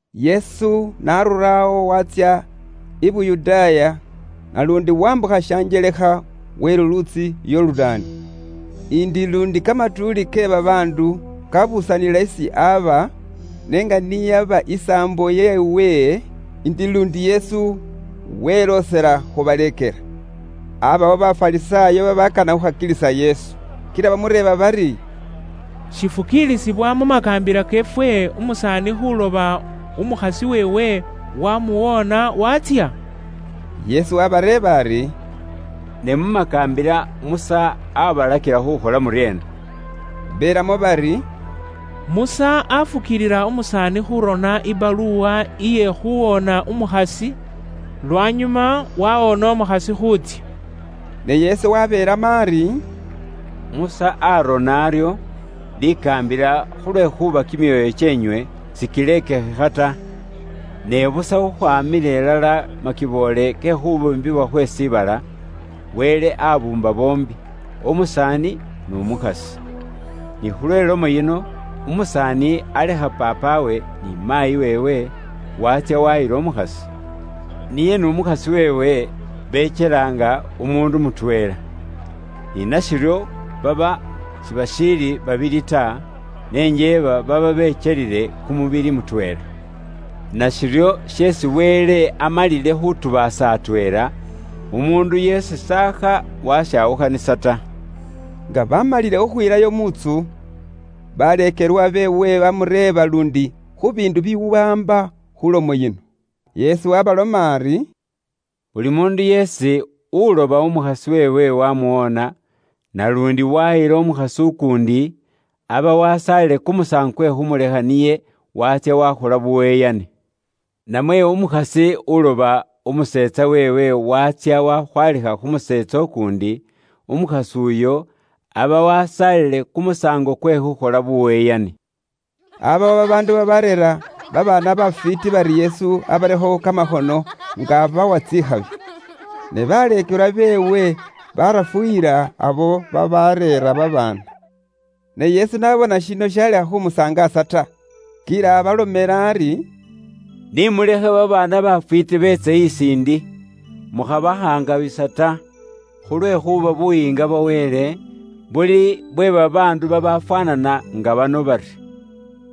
Yesu n'arura awo waatsya i Yuda, naluundi wambukha shanjelekha we luluutsi Yorudaani. Indi luundi kamatuuli ke babaandu kabuusanila isi aba; ne nga ni yaba isaambo yeewe, indi luundi Yesu weloosela khubaleekela. Aabaawo Bafarisaayo babaakana khuukhakilisa Yesu. Kila bamureeba bari, “Shifukiilisibwa mu makaambila keefwe umusaani khuuloba umukhasi weewe waamuwoona waatsya?” Yesu waabareeba ari, “Ne mu makaambila Musa aabalakila khuukhola muryeena?” Beelamo bari, “Musa afukiilila umusaani khuurona buurone bwe khuuwoona umukhasi, lwanyuma waawoona umukhasi khuutsya.” Ne Yesu wabeelamo ari, “Musa aarona aryo likaambila khulwekhuuba kimyoyo kyeenywe sikilekikhila ta. Ne busa khukhwaamila ilala makiboole ke khubuumbibwa khwe shiibala, ‘Wele aabuumba boombi, umusaani n'umukhasi. Ni khulwe ilomo yino, umusaani alekha paapawe ni maayi weewe, waatsya waayila umukhasi. Niye n'umukhasi weewe bekyela nga umuundu mutweela.’ Ni nashiryo baba sibashiili babili ta, ne njeeba baba bekyelile kumubili mutweela. Nashiryo sheesi Wele amalile khutubaasa atweela, umuundu yeesi s'akha washawukhanisa ta.” Nga bamalile khukhwilayo mu ntsu, baleekelwa beewe bamureeba luundi khu biindu bibiwaamba khu lomo yino. Kor 7.10,11Yesu waabaloma ari, “Buli muundu yeesi uloba umukhasi weewe waamuwoona, naluundi waayila umukhasi ukuundi, aba wasaalile kumusaango kwe khuumulekha niye, waatsya waakhola buyeyani. Namwe umukhasi uloba umuseetsa weewe waatsya wakhwaalikha khu museetsa ukuundi, umukhasi uyo aba wasaalile kumusaango kwe khuukhola buyeyani.” Aabawo babaandu babaareera babaana bafwiiti bari Yesu abarekho kamakhono nga abawa tsikhabi. Ne baleekelwa beewe baarafuyila abo babaareera babaana. Ne Yesu n'abona shino shaalekha khumusangaasa ta, kila abalomela ari, “Ni mulekhe babaana bafwiiti beetse isi ndi, mukhabakhaangabisa ta; khulwekhuuba Buyiinga bwa Wele buli bwe babaandu babafwaanana nga bano bari.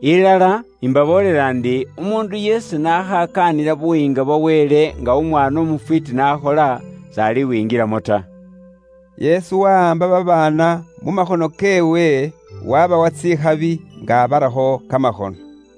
Ilala, imbaboolela ndi, umuundu yeesi n'akhakaanila Buyiinga bwa Wele nga umwaana umufwiiti n'akhola, s'alibwingilamo ta.” Yesu wahaamba babaana mu makhono keewe, waabawa tsikhabi, nga abarakho kamakhono.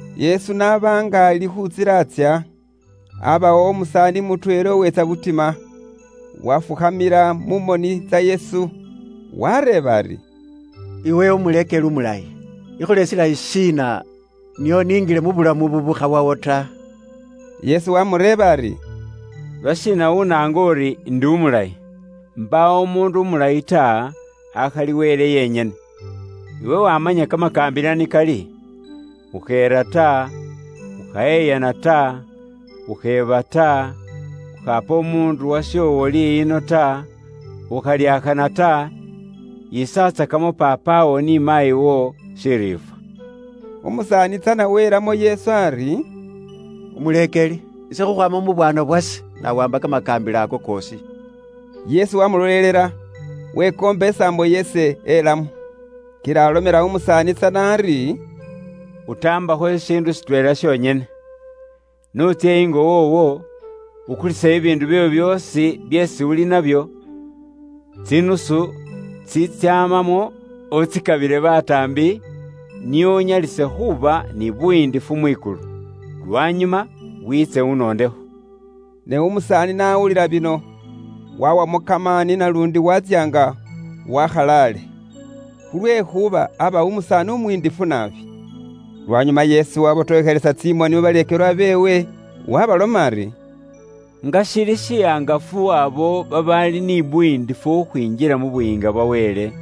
Yesu n'aba nga ali khu ntsila atsya, aabawo umusaani mutweela uweetsa butima, waafukhamila mu moni tsa Yesu, waareeba ari, “Iwe Umuleekeli umulayi, ikhole shilayi shiina nio ningile mu bulamu bubuukhawawo ta?” Yesu waamureeba ari, “Lwashiina unaanga uri indi umulayi? Mbaawo umuundu umulayi ta, akhali Wele yenyene. Iwe wamanya kamakaambila ni kali: ‘Ukheera ta, ukhayeyana ta, ukheeba ta, ukhaapa umuundu washoowo liyino ta, ukhalyakhana ta, yiisatsakamo paapawo ni maayiwo shiriifwa.’” Umusaani tsana welamo Yesu ari, “Umuleekeli, ise khukhwaama mu bwaana bwase, nawaamba kamakaambila ako koosi.” Yesu wamulolelela, waamukana isaambo yeesi elamo. Kila alomela umusaani tsana ari, “Utaambakho shishiindu shitweela shonyene. N'utsye ingo woowo, ukulise bibiindu byoowo byoosi byeesi uli ni nabyo, tsinusu tsitsyamamo utsikabile bataambi, nio unyalise khuuba ni buyiindifu mwikulu. Lwanyuma wiitse unondekho.” Ne umusaani n'awulila bino, waawamo kamaani naluundi waatsya nga wakhalale. Khulwekhuuba aaba umusaani umuyindifu naabi. Lwanyuma Yesu webotokhelesa tsimoni mu baleekelwa beewe, waabaloma ari, “Nga shili shihangafu abo babaali ni buyiindifu khukhwinjila mu Buyiinga bwa Wele!”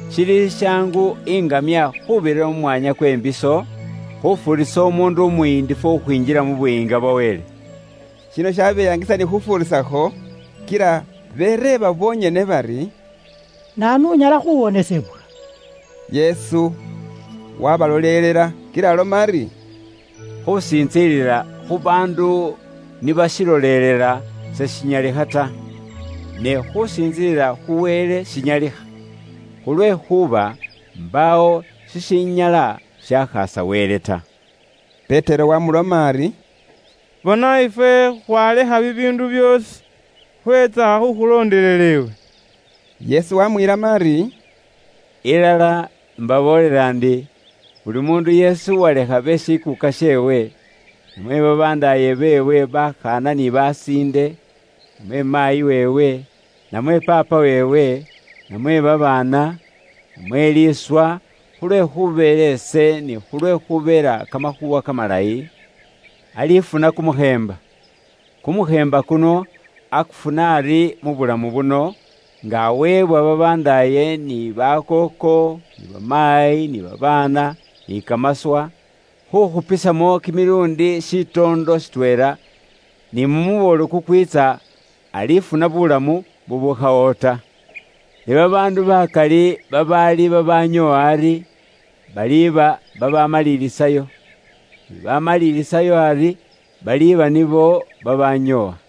Shili shishaangu iŋamya khuubirira mu mwaanya kwe mbiso, khufuurisa umuundu umuyindifu khukhwinjila mu Buyiinga bwa Wele.” Shino shabeyangisa ni khufuurisakho, kila bereeba bonyene bari, “Naanu unyala khuwonesebwa?” Yesu wabalolelela, kila aloma ari, “Khusintsilila khu baandu ni bashilolelela seshinyalikha ta. Ne khusintsilila khu Wele shinyalikha, khulwekhuuba mbaawo shishinyala shakhaasa Wele ta.” Petero wamuloma ari, “Bona ifwe khwalekha bibiindu byoosi khwetsa khukhulondelela iwe.” Yesu wamwilamo ari, “Ilala, mbaboolela ndi, buli umuundu yeesi uwalekha be shikuuka sheewe, namwe babandaaye beewe ni bakooko, namwe maayi weewe, namwe paapa weewe, namwe babaana, namwe liiswa, khulwe khubeela ise ni khulwe khubeela Kamakhuuwa Kamalayi, alifuna kumukheemba. Kumukheemba kuno akufuna ari mu bulamu buno nga aweebwa babandaaye ni bakooko ni bamaayi ni babaana ni kamaswa, khukhupanisamo kimiluundi shitoondo shitweela, ni mu muboolo kukwiitsa, alifuna buulamu bubukhawawo ta. Ne babaandu bakali babaali babanyoowa ari, baliba babamalilisayo, ni babamalilisayo ari, baliba nibo babanyoowa.”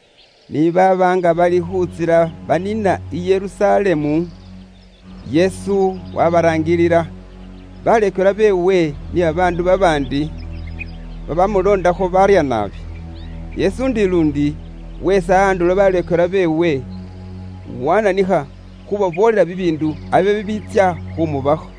Ni baaba nga bali khu ntsila baniina i Yerusalemu, Yesu wabaraangilila, baleekelwa beewe ni babaandu babaandi babamuloondakho baarya naabi. Yesu indi luundi weesa andulo baleekelwa beewe, wananikha khubaboolela bibiindu abe bibiitsya khumubakho.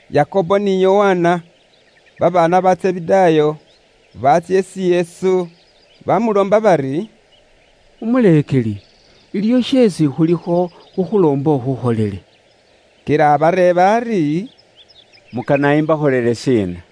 Yakobo ni Yokana, babaana ba Zebedaayo, baatsya isi Yesu baamuloomba bari, “Umuleekeli, iliwo sheesi khulikho khukhuloomba ukhukholele.” Kila abareeba ari, “Mukana imbakholele shiina?”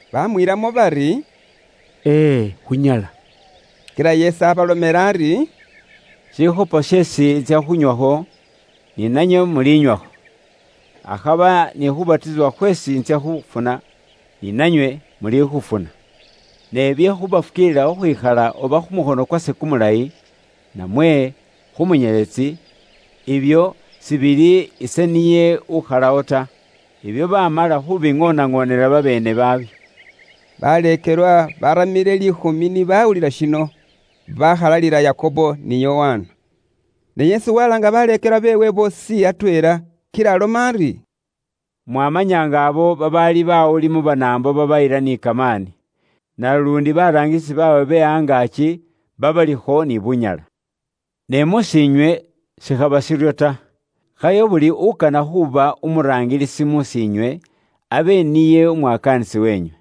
Bamwiilamo bari, “Ee, khunyala.” Kila Yesu abalomela ari, “Shikopo sheesi intsya khunywakho, ni nanywe mulinywakho; akhaba ni khubatisibwa khweesi ise intsya khufuna, ni nanywe muli khufuna. Ne bye khubafukiilila khukhwikhala oba khu mukhono kwase kumulayi namwe kumunyeletsi, ibyo sibili ise niye ukhalawo ta. Ibyo bamala khubiŋoonaŋoonela babeene babyo.” Baleekelwa babaramile liikhumi ni bawulila shino, bakhalalila Yakobo ni Yokana. Ne Yesu walaanga baleekelwa beewe boosi atweela kila aloma ari, “Mwamanya nga abo babaali bawuli mu Banaambo ni babayila ni kamaani. Naluundi baraangilisi baabwe be angaaki babalikho ni bunyala. Ne mus'iinywe, shikhaba shiryo ta; khayo buli ukana khuuba umuraangilisi mus'iinywe, abe niye umwakaanisi wenywe.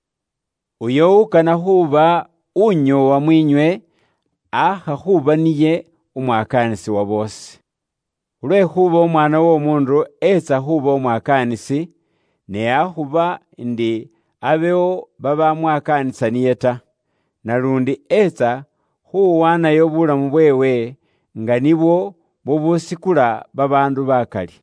Uyo ukana khuuba unyoowa mwiinywe, aakha khuuba niye umwakaanisi uwa boosi. Khulwekhuuba Umwaana w'Omuundu eetsa khuuba umwakaanisi, ne akhuba indi abewo babamwakaanisa niye ta. Naluundi eetsa khuwaanayo bulamu bweewe nga nibwo bubusikula babaandu bakali.”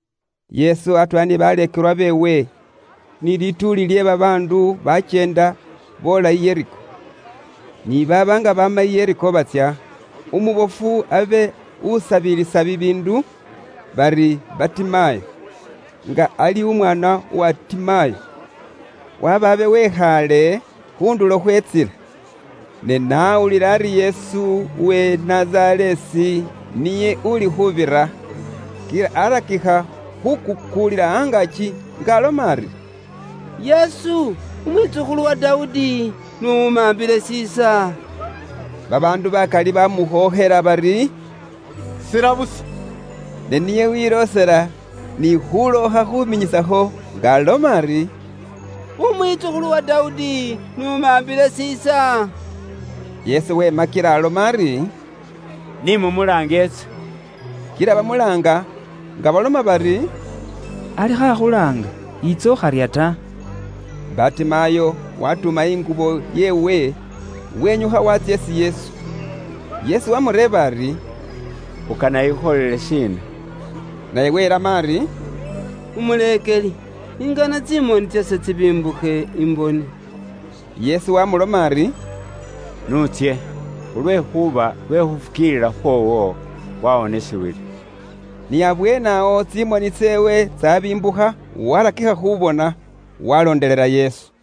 Yesu atweela ni baleekelwa beewe, ni lituuli lye babaandu bakyeenda boola i Yeriko. Ni baaba nga baama i Yeriko batsya, umubofu abe usabilisa bibiindu, bari Batimayo, nga ali umwaana uwa Timayo, waba abe wekhaale khu ndulo khwe intsila. Ne n'awulila ari Yesu uwe i Nazareesi niye uli khubira, kila arakikha khukuukuulila angaaki nga aloma ari, “Yesu, umwitsukhulu uwa Dawudi, n'umambile shiisa!” Babaandu bakali bamukhookhela bari, “Sila busa.” Ne niye weloosela ni khulookha khuminyisakho nga aloma ari, “Umwitsukhulu uwa Dawudi, n'umambile shiisa.” Yesu wema kila aloma ari, “Ni mumulaange etse.” Kila bamulaanga nga baloma bari, “Alikho akhulaanga. Yiitsa, ukharya ta!” Batimayo watuuma ingubo yeewe, wenyukha waatsya isi Yesu. Yesu waamureeba ari, “Ukana ikhukholele shiina?” Naye welamo ari, “Umuleekeli, ingana tsimoni tsase tsibimbukhe, imbone.” Yesu waamuloma ari, “N'utsye, khulwekhuuba lwe khufukiilila khwoowo wawonisibwile.” Ni abweene awo tsimoni tseewe tsaabimbukha waarakikha khuubona, waalondelela Yesu.